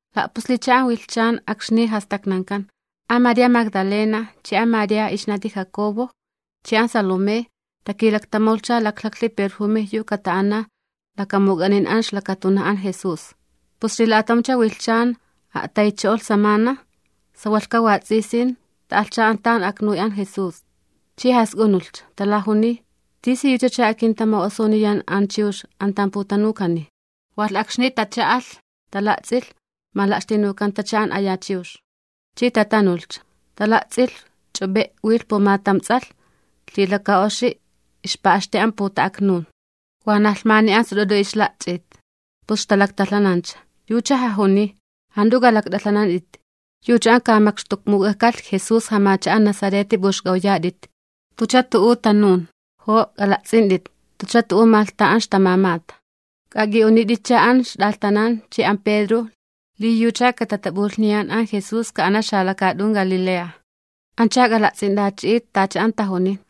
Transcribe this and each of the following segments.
La'puslicha an wilhchan akxni jastaknankan, an María Magdalena chi an María ixnati Jacobo, chi an Salomé, takilaktamawlhcha laklhaklhi perjume yu kata'ana lakamuk'anin an ixlakatunaj an Jesús. Pus xlila'atamcha wilhchan a'taynicho'olh samana, sawalhka wats'isin, ta'alhcha an tan aknuy Jesús, chi jask'unulhcha. Talajuniy: ―¿Tisiyuchacha akintama'osuniyan an chiwx an tan putanukani? Walh akxni tacha'alh, tala'ts'in mala'xtinukanta an aya chiwx. Chi tatanuchalh tala'ts'in ch'up'e' wilh pumatam ts'alh, lhilaka oxi ixpa'xti an puta'aknun, wanaj lhmani an sut'ut'u ixla'ch'it, pus ixtalaktalhanancha. Yucha jajuniy: ―Jant'u k'alakt'alhanant'it. Yucha an ka tamakxtukmuk'alh Jesús jamacha'a Nazareti p'uxk'awyat'it. Yucha la'awcho'olhcha, jantucha tu'u tanun. Jo' k'ala'ts'int'it, jantucha tu'u malh an tan ixtamamata. K'ajak'i'unit'iti an ixt'alhtanan chi an Pedro, li an Jesús yucha katatap'ulhniyan ka'ana xalakaat'un Galilea, anch'a k'ala'ts'int'achi'it tacha ixtajuntancha.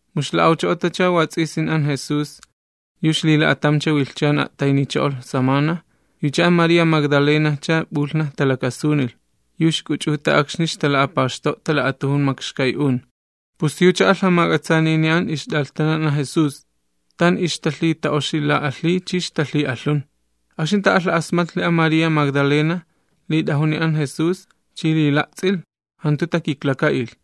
Mu ixla'awcho'otacha wats'isin an Jesús, yu xlila'atamcha wilhchan a'taynicho'olh samana, yucha an María Magdalenajcha p'ulhnaj talakasunilh, yu ixk'uch'uta akxni ixtala'apaxto'ta la'atujun makxkay'un. Pus yucha alh jamak'atsanini an ixt'alhtanan an Jesús, tan ixtalhita'oxila'alhiy chi ixtalhi'alhun. Akxni ta'alha'asmatlhi an María Magdalena, li la'ajunta an Jesús chi li la'ts'ilh, jantu takiklaka'ilh.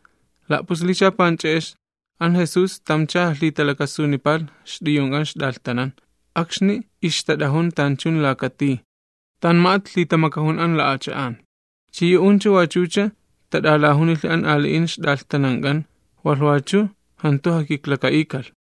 La'puslicha panch'e'ex, an Jesús tamcha jalhitalakasunipalh ixt'uyunk'an ixt'alhtanan, akxni ixtat'ajun tanchun laka tij, ma'spa an la'acha'an. Chi yu'uncha wachucha tat'alajunilhi an ali'in ixt'alhtanank'an, walh wachu jantu jakiklaka'ikalh.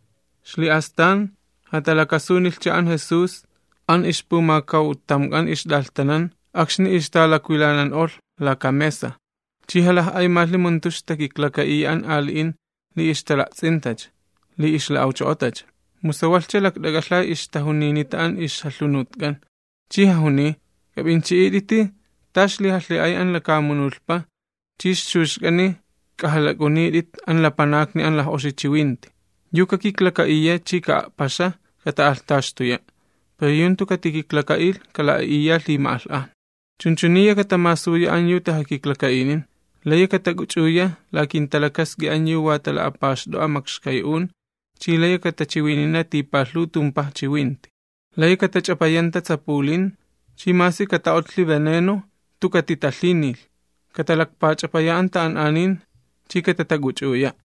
Xli'astan jatalakasunilhcha an Jesús an ixpumakawtamk'an ixt'alhtanan akxni ixtalakwilanan'olh laka mesa, chi jalaj'aymalhi mu jantu ixtat'alakiklaka'iya an ali'in li ixtala'ts'intacha li ixla'awcho'otacha, mu sawalhcha lakt'ak'alha ixtajuninita an ixjalhunutk'an. Chi jajuniy: ―K'ap'inchi'it'iti ta ixlijalhi'ay an lakamunulhpa chi ixchuxk'ani k'ajalak'unit'it an lapanakni an laj'oxi chiwinti. Yu kakiklaka'iya chi ka'a'paxa, kata'alhtaxtuya'. Pero yu jantu katikiklaka'ilh, kala'a'iya lhima'alh'ajna. Chunchuniya katamasuya an yu tajakiklaka'inin: layi katak'uch'uya la kinta'a'ut an yu wa tala'apaxt'o'a makxkay'un, chi layi katachiwinina tipalhuw tumpaj chiwinti. Layi katach'apayanta tsapulin, chi masi kata'otlhi veneno, jantu katitalhinilh; katalakpach'apaya an ta'an'anin, chi katatak'uch'uya'.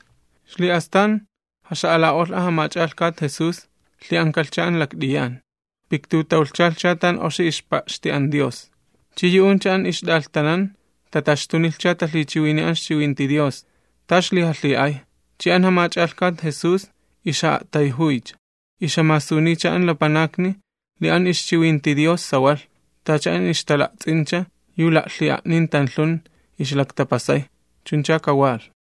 Xli'astan jaxa'ala'olh an jamach'alhkat Jesús, lhi'ankalhcha an lakt'iyan, piktutawlhchalhcha tan oxi ixpa'xti an Dios. Chi yu'uncha an ixt'alhtanan tataxtunilhcha talhichiwiniy an ixchiwinti Dios, ta ixlijalhi'ay, chi an jamach'alhkat Jesús ixja'a'tayjuycha, ixjamasuniycha an lapanakni li an ixchiwinti Dios sawalh, tacha an ixtala'ts'incha yu la'lhi'a'nin tanlhun ixlaktapasay. Chunchacha kawalh.]